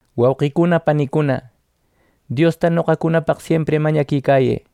Wauqicuna panicuna, Diosta noqacunapaq siempri mañaquicayë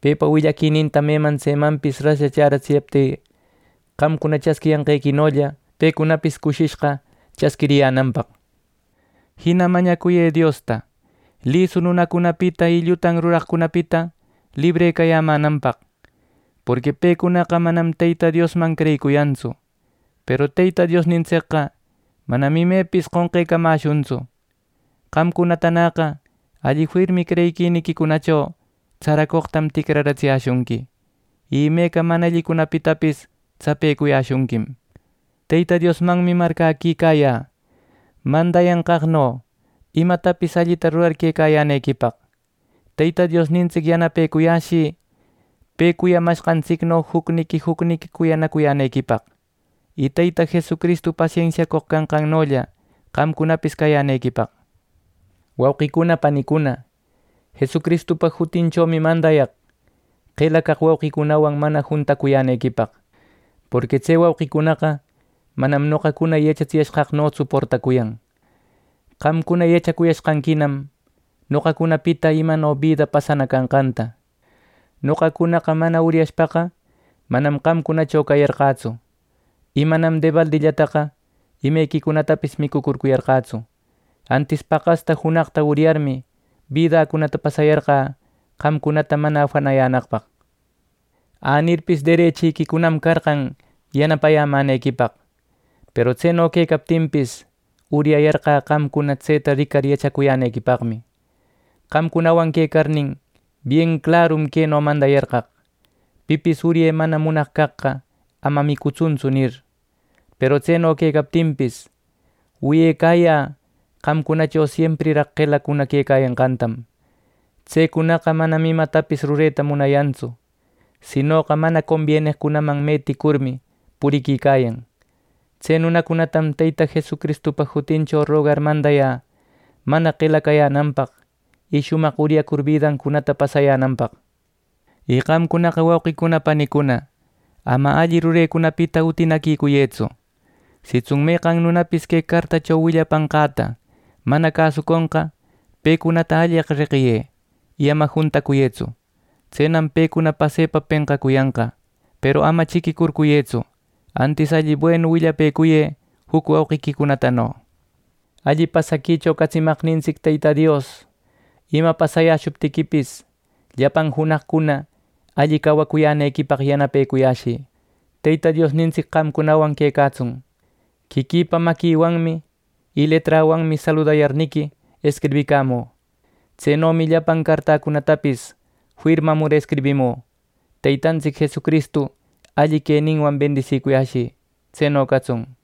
pepa willaquininta meman tsemanpis raslla chäratsiyaptï qamcuna chasquiyanqequinolla, pecunapis cushishqa chasquiriyänanpaq. Jina mañacuyë Diosta lisu nunacunapita y llutan ruraqcunapita librecayämänanpaq. Porqui pecunaqa manam Teyta Diosman creyicuyantsu. Peru Teyta Diosnintsicqa manam imepis qonqecamäshuntsu. Qamcunatanäqa alli firmi creyiquiniquicunacho tsaracoqtam ticraratsiyäshunqui, y imeca mana allicunapitapis tsapecuyäshunquim. Teyta Diosmanmi marcäquicayä mandayanqaqno imatapis allita rurar quecayänequipaq. Teyta Diosnintsic yanapecuyäshï pe cuyamanqantsicno jucniqui jucniqui cuyanacuyänequipaq, y Teyta Jesucristu pasensiacoq canqannolla qamcunapis cayänequipaq. Wauqicuna panicuna, Jesucristupa jutinchomi mandayaq qela caq wauqicunawan mana juntacuyänequipaq. Porqui tse wauqicunaqa manam noqacuna yachatsiyanqaqnotsu portacuyan. Qamcuna yachacuyashqanquim noqacunapita imano bida pasana canqänta. Noqacunaqa mana uryashpaqa, manam qamcunacho cayarqätsu. Y manam debalditaqa imequicunatapis micucurcuyarqätsu, antis paqasta junaqta uryarmi, bidäcunata pasayarqä qamcunata mana afanayänaqpaq. Änirpis, derechiquicunam carqan yanapayämänequipaq, peru tseno quecaptinpis, uryayarqä qamcuna tseta ricar yachacuyänequipaqmi. Qamcunawan quecarnin, bien clarum queno mandayarqaq: “Pipis urye mana munaq caqqa, ama micutsuntsu” nir. Peru tseno quecaptinpis, wiyecayä qamcunacho siempriraq qelacuna quecayanqantam. Tsecunaqa manam imatapis rureta munayantsu, sinoqa mana combieneqcunaman meticurmi puriquicayan. Tse nunacunatam Teyta Jesucristupa jutincho rogar mandayä mana qela cayänanpaq, y shumaq uryacur bidancunata pasayänanpaq. Y qamcunaqa, wauqicuna panicuna, ama alli rurecunapita utinäcuriyëtsu. Sitsun meqan nunapis que cartacho willapanqäta mana cäsuconqa, pecunata alleq reqiyë y ama juntacuyëtsu. Tsenam pecuna pasepa penqacuyanqa. Peru ama chiquicurcuyëtsu; antis alli buenu willapëcuyë juc wauqiquicunatano. Alli pasaquicho catsimaqnintsic Teyta Dios ima pasayäshuptiquipis, llapan junaqcuna alli cawacuyänequipaq yanapecuyäshï. Teyta Diosnintsic qamcunawan quecatsun. Quiquïpa maquiwanmi y leträwanmi saludayarniqui escribicamü. Tsenomi llapan cartäcunatapis firmamur escribimü. Teytantsic Jesucristu alli queninwan bendisicuyashï. ˻¡Tseno catsun!˼